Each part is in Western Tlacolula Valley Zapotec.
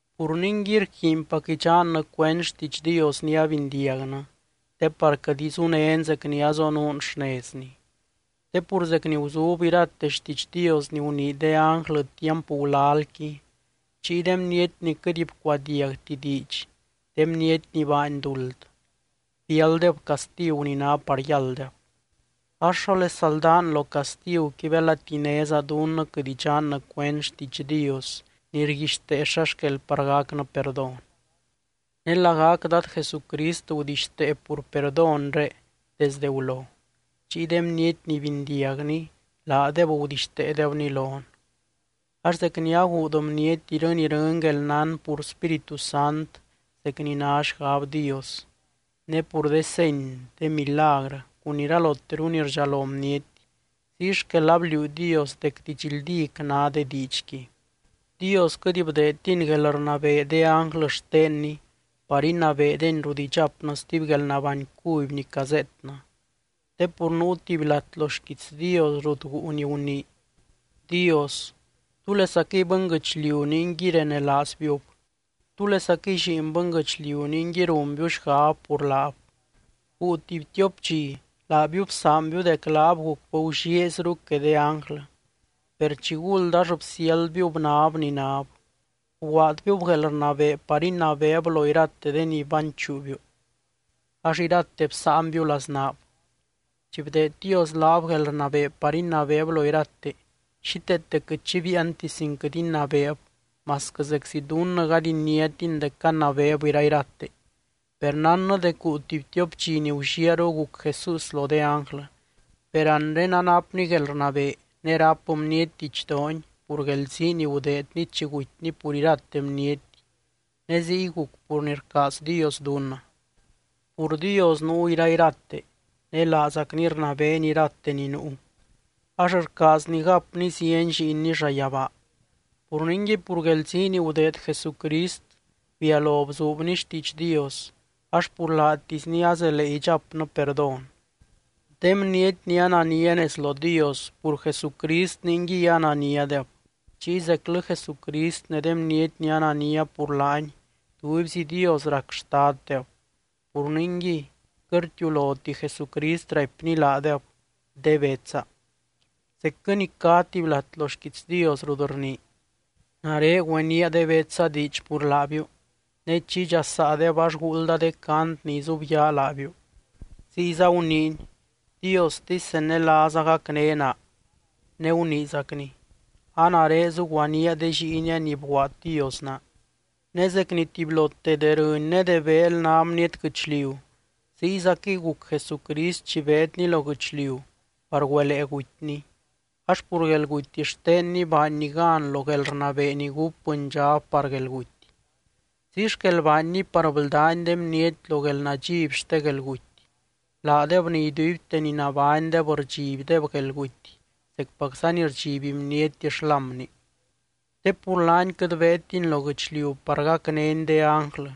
Pur ningui, rquiinpac idxannɨ cuend xtiidx Dios ni abindiagnɨ te par quɨt izunén zec ni azonuun xnezny. Te pur zec ni guzub irate xtiidx Dios ni gunii de ánglɨ tiamp gulalqui, chiy de bniety ni quɨt bcuadiagti diidx, de bniety ni baany duld biálddeb castigu ni ná par yálddeb. Ax, ¿xólesa ldán lo castiguqui belati néza dunnɨ quɨt idxannɨ cuend xtiidx Dios ni rguixtee xa xquel par gacnɨ perdón? Ne lagac Dad Jesucrist gudixtee pur perdónre desdɨ gulo, chiy de bniety ni bindiagni, laadeb gudixteedebni lon. Ax zec ni aguud bniety irɨny irɨny guelnán pur Spíritu Sant zec ni ná xgab Dios, ne pur de seny, de milagrɨ cun iraloteru ni rdxalo bniety, ziy xquel abliuu Dios dec didxldíc ná de diidxqui. Dios quɨt bdeedtiny guelrnabee de ánglɨ xtenny par inabeedeny rut idxapnɨ stuby guelnabány cuby ni cazeetnɨ, te pur nuu tuby lat lo xquiits Dios rut guu ni gunii: Dios, ¿túlesaquɨy bɨnguɨchliu ningui renelaazbiub? ¿Túlesaquɨy lliin bɨnguɨchliu ningui runbiu xgab pur laab? Guu tuby tiop dxi laabiu bsaanbiu dec laab gucbɨ gullieezru que de ánglɨ, per chiguld ax bsiáldbiub náb ni náb, bguaadbiúb guelrnabee par inabeeb lo irate de ni banchuubiu ax irate bsáanbiu laznaab. Chi bdeed Dios laab guelrnabee par inabeeb lo irate, xíteete quɨt xi biianti sin quɨt inabeeb masquɨ zeczi dunnɨ gady iniátin dec canabeeb irairate. Per nánnɨ dec guu tuby tiop dxi ni gulliaru guc Jesús lo de ánglɨ. Per anre anapny guelrnabee ne ráp bniety didxdoony pur guelzii ni gudeedny chi gutyny pur irate bniety, ne ziy guc pur ni rcaaz Dios dunnɨ. Pur Dios nuu irairate, ne laazacny rnabeeny irate ni nuu, ax rcaazny gapny zieny lliinny llayabaa. Pur ningui, pur guelzii ni gudeed Jesucrist bialo bzuubny xtiidx Dios, ax pur laatisny azelee idxapnɨ perdón. De bniety ni anania nez lo Dios, pur Jesucrist ningui ananiadeb. Chiy zeclɨ Jesucrist ne de bniety ni anania pur laany, tubyzi Dios rac xtaddeb. Pur ningui, quɨt rtiuloti Jesucrist raipny laadeb: De betsa. Zecquɨ ni cá tuby lat lo xquiits Dios rut rnii: Nare güenía de betsa diidx pur laabiu, ne chi idxasaadeb ax guuldda de cant ni izubyaa laabiu. Ziyza guniiny: Diostisy zenelaaza gacné naa. Ne guniizacny: A nare zuguaníaa de lliinia ni bguaad Dios naa. Ne zec ni tubylote de rɨny ne de beel ná bniety guɨchliu, ziyzaquɨy guc Jesucrist chi beedny lo guɨchliu par güelee gutyny, ax pur guelguty xtenny baanny gan lo guelrnabee ni gúp bɨndxab par guelguty. Ziy xquel baanny par bldány de bniety lo guelnadxiby xte guelguty, laadeb ni iduibte ni nabánydeb rdxibdeb guelguty zecpacza ni rdxiby bniety xlámni. Te pur laany quɨt beedtiny lo guɨchliu par gacnény de ánglɨ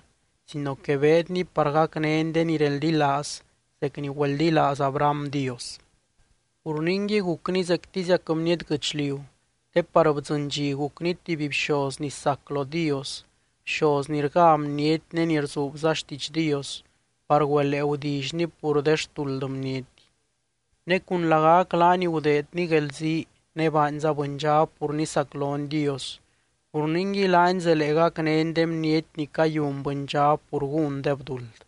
sino que beedny par gacnény de ni reldilaaz zec ni güeldilaaz Abraham Dios. Pur ningui, gucny zectiziac bniety guɨchliu, te par bdzɨny dxi gucny tuby bxoz ni sac lo Dios, bxoz ni rgá bniety ne ni rzuubza xtiidx Dios par güelee gudillyny pur de xtuld bniety. Ne cun lagac laany gudeedny guelzii ne baanza bɨndxab pur nisaclony Dios, pur ningui laany zelee gacnény de bniety ni cayun bɨndxab pur gúndeb duld.